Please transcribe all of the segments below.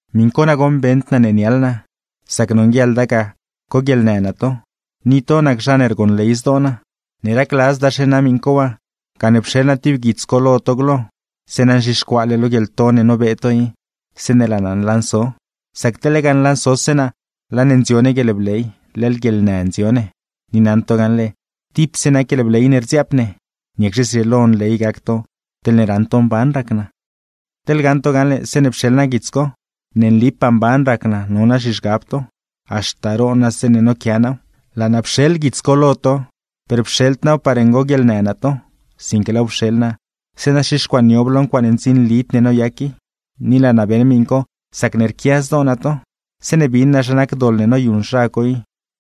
Miṉ co nagoṉ beṉd naa ne niaḻ naa, sac nonguieḻda ga coguieḻnë naa to, ni to nac zha ne rgonley zdoo naa. Ne racladzdaxe naa miṉ co waa, gane pxeḻ naa tib guits co lo to glo, zeeṉa nzhixcuaale lo guieḻto ne nobee to i, zeeṉe laa naa nlanso. Sac teḻ lega nlansose naa, laa ne ndzio ne guieḻbley, leḻ guieḻnë ndzio ne. Ni naṉ to gaṉle, tipse nac guieḻbley ne rdziaap ne; ¿niacxe zrieelo nley gac to teḻne raṉ to mban rac naa? Teḻ gaṉ to gaṉle zeeṉe pxeḻ naa guits co, ¡ne nlipaa mban rac naa no naa zhizhgab to! Haxta roon naa zeeṉe noquiaa naaw. Laa naa pxeḻ guits co lo to, per pxeḻd naaw par ngoguieḻnë naa to; sinque laaw pxeḻ naa, zeeṉa xixcuaaniob lo ncuaaṉe ndzinlid ne noyac i; ni laa naa beṉ miṉ co sacne rquia zdoo naa to. Zeeṉe bin naa zha nac doḻ ne noyuṉ zha co i,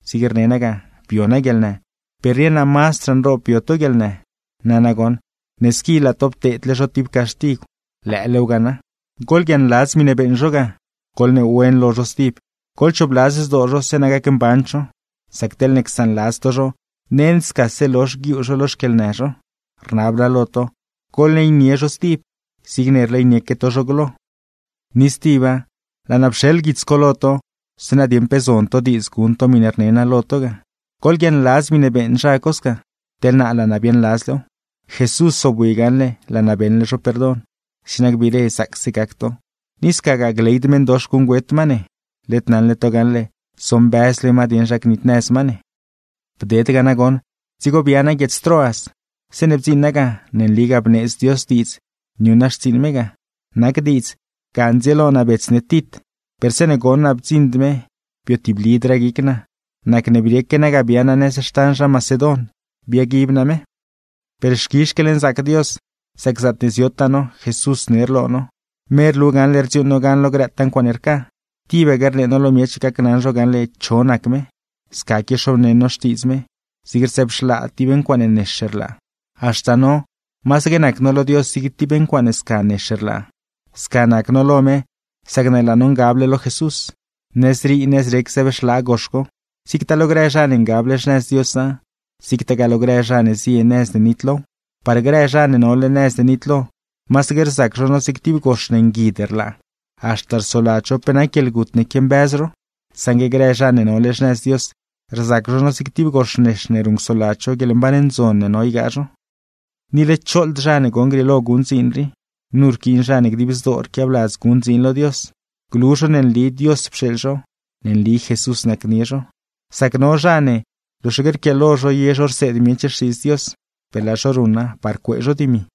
zig rne naa ga: bio naa guieḻnë; per rieṉ naa mazdraa nroob bio to guieḻnë. Nana goṉ, ne squi laa to pteedle zho tib caxtigw, ¡lëëlew ga na! Goḻguiaaṉladz miṉe beeṉ zho ga, goḻneewen lo zho stib, goḻchoobladz zdoo zho zeeṉa gacmband zho. Sac teḻne csaanladz to zho, nend scase lozh guiuu zho lo xquieḻnë zho. Rnab naa lo to, goḻleynie zho stib, zigne rleynieque to zho glo. Ni stiba, laa naa pxeḻ guits co lo to, zeeṉa dieṉ pe zon to diidz guṉ to miṉe rne naa lo to ga. Goḻguiaaṉladz miṉe beeṉ zha co sca, teḻ naa laa naa biaaṉladzlew. Jesús zobwi gaṉle laa naa beṉle zho perdon, zeeṉa gbiire zaacse gac to; ni scagaa gleyd meṉdox guṉgüet ma ne. Led naṉle to gaṉle, zombëzle ma dieṉ zha gnitnëz ma ne. Bded ga nagoṉ dzigo bia naa guiedz Troas. Zeeṉe bdziṉ naa ga, ne nligaa bneedz Dios diidz niuṉ naa xtsiiṉ me ga. Nac diidz ga ndzieelo naa bets ne Tit, per zeeṉe goṉ naa bdziṉd me, biotiblidraa guic naa. Nacne brieque naa ga bia naa nëz xtan zha Macedon, biaguib naa me. Per, ¡xquizh xquieḻnzaac Dios! Sac zaatne ziotaa no, Jesús ner lo no, me rlu gaṉle rdziuuṉ no gan lo grëtaa ncuaaṉe rca. Tibaque rnee no lo miech gacnaṉ zho gaṉle cho nac me, sca quiaxobneṉ no Xtiidz me, zig rzëbxlaa tib ncuaaṉe nex rlaa. Haxta no, masaque nac no lo Dios zig tib ncuaaṉe sca nex rlaa; sca nac no lo me sacne laa no ngable lo Jesús. Nëzrii nëzrec nex zëbxlaa gox co, zigtaa lo grë zha ne ngable xnëz Diosa, zigtagaa lo grë zha ne zie nëz ne nitlow. Par grë zha ne nole nëz ne nitlo, masaque rzac zho no zig tib gox ne nguid rlaa, haxta rsoladz zho pe nac guieḻgut ne quiambëz zho; saṉgue grë zha ne nole xnëz Dios, rzac zho no zig tib gox nex ne ruṉcsoladz zho guieḻmban ndzon ne no ygaa zho. ¡Ni led choḻd zha ne goṉ grieelo guṉ dziin rii! Nu rquiin zha ne dib zdoo rquiabladz guṉ dziin lo Dios, glu zho ne nli Dios pxeeḻ zho, ne nli Jesús nacnie zho. Sac no zha ne, loxaque rquiaalo zho ye zho rseed miech Xtiidz Dios, per laa zho ruṉa par cuee zho dimi.